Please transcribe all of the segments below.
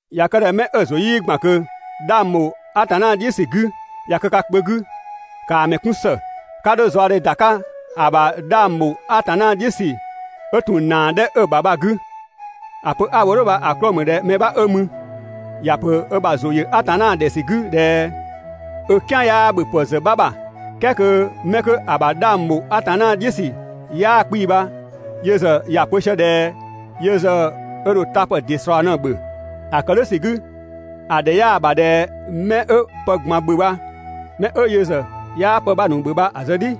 ꞊Ya kë ꞊dhɛ mɛ 'ö‑ ‑zʋ 'yii ‑gban ꞊kö 'dhang ‑bho Atanna "dhiʋ̈ ‑sü 'gü ꞊ya kë ka kpö 'gü, ‑kaa ‑mɛ 'kun ‑së, 'ka 'dho zaɔdhe ‑da 'ka ‑a ‑bha 'dhang bho Atanna "dhiʋ̈ ‑sü 'ö ‑tun ‑naa 'dhɛ 'ö ‑ta bha‑ 'gü. ‑A pö 'a‑ wo "dhʋ̈ bha‑ 'klɔɔ‑ ‑mü ꞊dhɛ mɛ 'bha 'ö mü, ‑ya ‑pö ö ‑bha ‑zʋ ‑yö Atanna ‑dhɛ ‑sü 'gü ꞊dhɛ 'ö "kian ‑yaa ‑bhöpë ‑zë 'bha ‑bha. "Kɛɛ kö 'mɛ 'kö‑ ‑bha 'dhang ‑bho Atanna "dhiʋ̈ ‑sü 'yaa 'kpii‑ bha yö ‑zë ‑ya pö sië ꞊dhɛ yö ‑zë ö ‑dho tapë ‑dɩ ‑slɔɔ ꞊në‑ ‑bhö. ‑A ‑kë "dhʋ̈ ‑sü 'gü, ‑a ‑dhɛ 'yaa‑ ‑bha ꞊dhɛ 'mɛ 'ö pë ꞊gban ‑bhö bha ‑yö mɛ 'ö yö ‑zë 'yaa pë 'bha ‑nu ‑bhö bha‑ zë "dhi.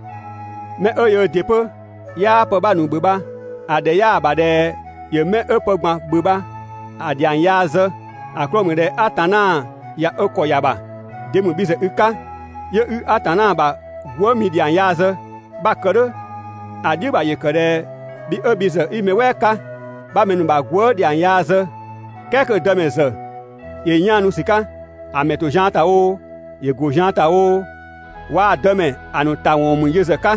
Mɛ 'ö yöö ‑dɩ 'pö 'yaa pë 'bha ‑nu ‑bhö bha, ‑a ‑dhɛ 'yaa‑ ‑bha ꞊dhɛ ‑yö 'mɛ 'ö pë ꞊gban ‑bhö bha‑ ‑dhiang yaa zë, ‑a 'klɔɔ‑ ‑mü ꞊dhɛ Atanna ꞊ya ö ‑kɔ ‑ya ‑bha. De ‑mü bhi ‑zë i 'ka 'yö 'i Atanna ‑bha gwëëmi ‑dhiang yaa zë? 'Bha‑ kë "dhʋ̈ ‑a "dhiʋ̈ ‑bha ‑yö kë ꞊dhɛ bhi 'ö bhi ‑zë 'i mɛ "wɛɛ 'ka 'bha mɛ ‑nu ‑bha gwëë" ‑dhiang yaa zë, "kɛɛ kö‑ dëmɛ ‑zë ‑yö 'yaanu ‑sü 'ka. ‑A ‑mɛ ‑to zian ‑ta oo, ‑yö ‑go zian ‑ta oo, waa‑ dëmɛ ‑a ‑nu ‑ta ‑wɔn ‑mü yö ‑zë 'ka.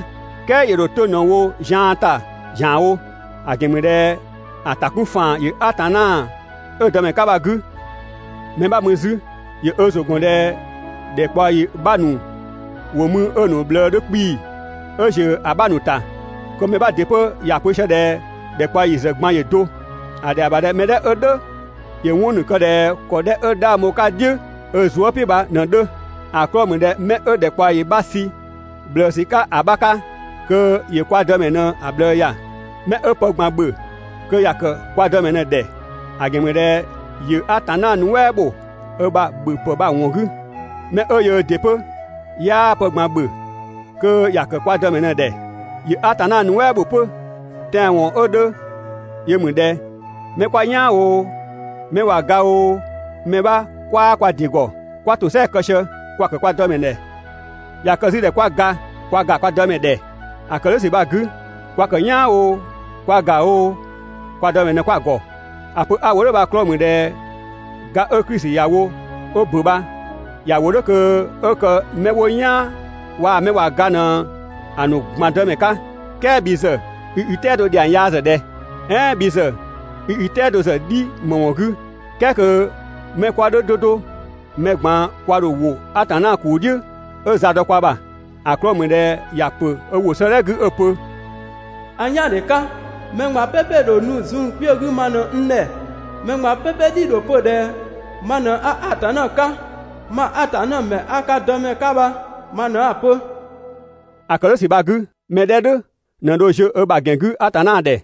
"Kɛɛ ‑yö ‑dho 'to ꞊në‑ wo zian ‑ta ‑zianwo, ‑a ‑gɛn ‑mü ꞊dhɛ ‑a ‑ta 'kun ‑faan ‑yö Atanna 'ö‑ Dëmɛ 'ka bha‑ 'gü. Mɛ 'bha‑ mü 'zü ‑yö ö ‑zʋ ‑gɔn ꞊dhɛ ‑dhɛkpaɔyi 'bha ‑nu ‑wo mü 'ö‑ ‑nu ꞊bhlëë 'dhö 'kpii‑ 'ö ‑ziö ‑a 'bha ‑nu ‑ta, kö mɛ 'bha ‑dɩ 'pö ‑ya pö sië ꞊dhɛ ‑dhɛkpaɔyi ‑zë ꞊gban ‑yö do. ‑A ‑dhɛa ‑bha ꞊dhɛ mɛ "dhɛ 'ö "dhʋ̈ ‑yö 'wɔn ‑nu kë ꞊dhɛ ‑kɔ 'dhɛ 'ö 'dhang bho‑ "dhiʋ̈ ö zuë" "piʋ̈ bha ꞊në‑ 'dhö. ‑A 'klɔɔ‑ ‑mü ꞊dhɛ mɛ 'ö ‑dhɛkpaɔyi 'bha sü ꞊bhlëësü 'ka ‑a 'bha 'ka, kö ‑yö kwa Dëmɛ ꞊në‑ ꞊bhlëë ‑ya. 'Mɛ 'ö pë ꞊gban ‑bhö kö ‑ya ‑kë kwa Dëmɛ ‑dhɛ, ‑a ‑gɛn ‑mü ꞊dhɛ ‑yö Atanna nuɛ" ‑bho 'ö ‑bha ‑bhöpë bha‑ ‑wɔn 'gü. Mɛ 'ö yöö ‑dɩ 'pö 'yaa pë ꞊gban ‑bhö, kö ‑ya ‑kë kwa Dëmɛ ‑dhɛ, ‑yö Atanna nuɛ" ‑bho 'pö. Tɛanwɔn 'ö 'dhö yö ‑mü ꞊dhɛ: Mɛ 'kwa "yaan oo, mɛ ꞊wa ga oo, mɛ 'bha 'kwaa kwa ‑dɩ ‑gɔ. 'Kwa ‑tosɛa kë sië, kwa‑ ‑kë kwa Dëmɛ ‑dhɛ. ꞊Ya kë 'zü ꞊dhɛ 'kwa ga, kwa ‑ga kwa Dëmɛ ‑dhɛ. ‑A ‑kë "dhʋ̈ ‑sü bha‑ 'gü, kwa ‑kë "yaan oo, kwa ‑ga oo, kwa Dëmɛ ꞊në 'kwa‑ ‑gɔ. ‑A pö 'a‑ wo "dhʋ̈ bha‑ 'klɔɔ‑ ‑mü ꞊dhɛ ga 'ö Klisi ‑ya wo 'ö ‑bö bha ‑ya ‑wo "dhʋ̈ kö 'ö kë mɛ 'wo "yaan waa‑ mɛ ꞊wa ga ꞊në‑ ‑nu ꞊gban Dëmɛ 'ka. "Kɛɛ bhi ‑zë, i i "tɛado ‑dhiang yaa ‑zë ꞊dhɛ, "ɛɛn bhi ‑zë i i "tɛado ‑zë "dhi ‑më ‑wɔn 'gü, "kɛɛ kö mɛ 'kwa "dhʋ̈ 'do 'do, mɛ ꞊gban kwa ‑dho ‑wo Atanna ‑kuu "dhiʋ̈ 'ö za dɔ kwa ‑bha. ‑A 'klɔɔ‑ ‑mü ꞊dhɛ ‑ya ‑pö ö ‑wʋ 'sëëdhɛ 'gü 'ö‑ pö: «A "yaandhe 'ka, mɛ ꞊gban "pɛpɛ ‑dho nu zun kpiö 'gü ma ꞊në n ‑dhɛ. Mɛ ꞊gban "pɛpɛ "dhi‑ ‑dho pö ꞊dhɛ ma ꞊në 'a Atanna 'ka. Mang Atanna ‑mɛ 'a ka Dëmɛ 'ka bha ma ꞊në 'a‑ pö.» ‑A ‑kë "dhʋ̈ ‑sü bha‑ 'gü, 'mɛ 'dhɛ "dhʋ̈ ꞊në dho ziö ö ‑bha ‑gɛn 'gü Atanna ‑dhɛ.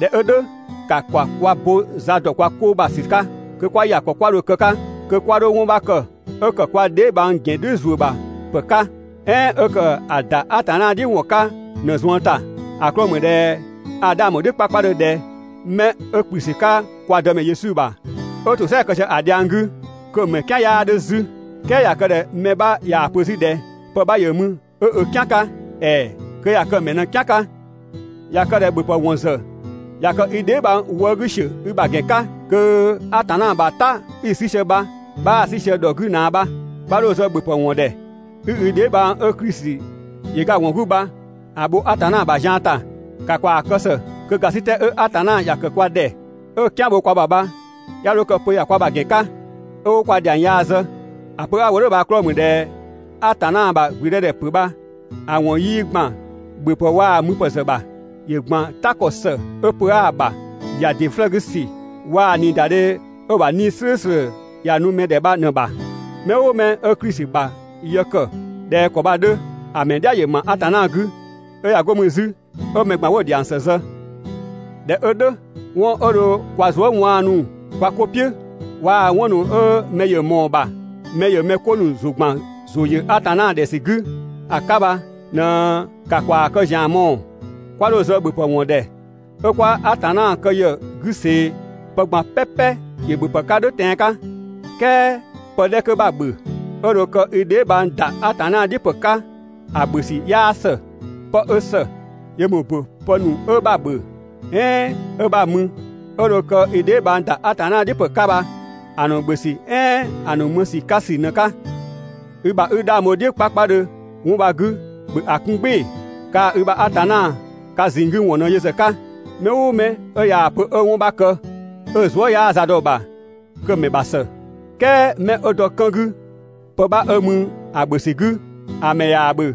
꞊Dhɛ 'ö "dhʋ̈, ‑ka ‑kwa kwa bo za ‑dɔ kwa 'ko ‑bha ‑sü 'ka kö 'kwa ‑ya ‑kɔ 'kwa dho‑ kë‑ 'ka kö 'kwa 'dho 'wɔn 'bha kë 'ö ‑kë kwa dheebhang ‑gɛn "dhiʋ̈ ‑zuö ‑bha ‑pë 'ka, "ɛɛn 'ö ‑kë ‑a ‑da Atanna "dhiʋ̈ ‑wɔn 'ka ꞊në‑ zuën ‑ta. ‑A 'klɔɔ‑ ‑mü ꞊dhɛ a 'dhang ‑bho "dhiʋ̈ 'kpakpadhö ꞊dhɛ 'mɛ 'ö ‑kplü ‑sü 'ka kwa Dëmɛ Yesu ‑bha, 'ö ‑tosɛa kë sië‑ dhiang 'gü, kö‑ ‑mɛ "kian 'yaa 'dhö 'zü. "Kɛɛ ꞊ya kë ꞊dhɛ mɛ 'bha ꞊yaa‑ pö 'zü ꞊dhɛ pë 'bha ‑yö mü 'ö ö "kian 'ka, ‑ɛɛ, kö ꞊ya kë‑ ‑mɛ ꞊në‑ "kian 'ka. ꞊Ya kë ꞊dhɛ ‑bhöpë ‑wɔn ‑zë ꞊ya kë i dheebhang wëë' 'gü ‑siö i ‑bha ‑gɛn 'ka, kö Atanna ‑bha "ta 'i‑ 'sü sië bha 'bhaa‑ 'sü sië ‑dhɔ 'gü ꞊naa bha. 'Bha 'dho zë ‑bhöpë ‑wɔn ‑dhɛ 'i i dheebhang 'ö Klisi ‑yö ga‑ ‑wɔn 'gü bha‑ bho Atanna ‑bha zian ‑ta. ‑Ka ‑kwaa kë ‑së kö ‑gasitɛ 'ö Atanna ‑ya ‑kë kwa ‑dhɛ 'ö "kian bho kwa ‑bha bha 'ya 'dho kë pö ‑ya kwa ‑bha ‑gɛn 'ka, 'ö 'wo kwa ‑dhiang yaa zë. ‑A pö 'a‑ wo "dhʋ̈ bha‑ 'klɔɔ‑ ‑mü ꞊dhɛ Atanna ‑bha ‑gblüdëdhɛpö bha, ‑a ‑wɔn 'yii ‑gban ‑bhöpë 'waa müpë ‑zë ‑bha. ‑Yö ‑gban "ta ‑kɔ ‑së 'ö pö 'aa‑ ‑bha, ‑ya ‑dɩ 'flëë‑ 'gü ‑sü waa‑ ꞊niidadhe 'ö‑ ‑bha 'Nii‑ "slʋ̈ʋ̈slʋ̈ ‑ya nu mɛ ‑dhɛ bha ꞊në‑ bha. Mɛ "ʋʋ mɛ 'ö Klisi ‑bha yë ‑kë ꞊dhɛ ‑kɔ bha‑ 'dhö, ‑a ‑mɛ "dhia ‑yö ‑ma Atanna 'gü, 'ö ꞊ya 'go mü 'zü 'ö mɛ ꞊gban 'wo‑ ‑dhiang ‑së zë. ꞊Dhɛ 'ö "dhʋ̈, 'wɔn 'ö dho kwa zuë" 'waanu kwa 'ko "piʋ̈, waa‑ 'wɔn ‑nu 'ö mɛ ‑yö ꞊mɔɔ‑ ‑bha mɛ ‑yö mɛ 'ko ‑nu ‑zʋ ‑gban ‑zʋ ‑yö Atanna ‑dhɛ ‑sü 'gü ‑a 'ka bha ꞊në ‑ka ‑kwaa kë ‑zian mɔɔ‑. 'Kwa 'dho zë ‑bhöpë ‑wɔn ‑dhɛ 'ö 'kwa Atanna kë ‑yë 'gü ꞊see. Pë ꞊gban "pɛpɛ ‑yö ‑bhöpë 'ka "dhʋ̈ tɛan‑ 'ka, "kɛɛ pë 'dhɛ 'kö 'bha‑ ‑bhö, 'ö dho kë i dheebhang ‑da Atanna "dhiʋ̈ ‑pë 'ka ‑a ‑bhö ‑sü 'yaa ‑së. 'Pë 'ö ‑së, yö ‑mü ‑bo pë ‑nu 'ö 'bha‑ ‑bhö "ɛɛn 'ö 'bha‑ mü 'ö dho kë i dheebhang ‑da Atanna "dhiʋ̈ ‑pë 'ka bha‑ ‑nu ‑bhö ‑sü "ɛɛn‑ ‑nu mü ‑sü 'ka ‑sü ꞊në‑ 'ka. I ‑bha 'i 'dhang bho‑ "dhiʋ̈ 'kpakpadhö 'wɔn bha‑ 'gü, ‑bhö ‑a 'kun "gbɩɩ‑. Kaa‑ i ‑bha Atanna ka ꞊zinng 'gü ‑wɔn ꞊në yö ‑zë 'ka. Mɛ "ʋʋ mɛ 'ö ꞊yaa‑ pö 'ö 'wɔn 'bha kë 'ö‑ zuë" 'yaa za dɔ‑ ‑bha kö‑ ‑mɛ ‑bha ‑së. "Kɛɛ mɛ 'ö dɔ 'kën 'gü pë 'bha 'ö mü‑ ‑bhö ‑sü 'gü, ‑a ‑mɛ ꞊yaa‑ ‑bhö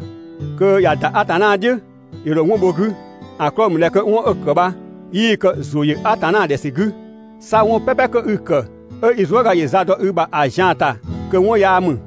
kö ꞊ya ‑da Atanna "dhiʋ̈, ‑yö ‑dho 'wɔn bho‑ 'gü, ‑a 'klɔɔ‑ ‑mü ꞊dhɛ kö 'wɔn 'ö‑ ‑kë bha, 'yii‑ kë ‑zʋ ‑yö Atanna ‑dhɛ ‑sü 'gü. 'Sa 'wɔn "pɛpɛ kö 'i‑ ‑kë 'ö i zuëga ‑yö za dɔ i ‑bha ‑a zian‑ ‑ta kö 'wɔn yaa ‑mü.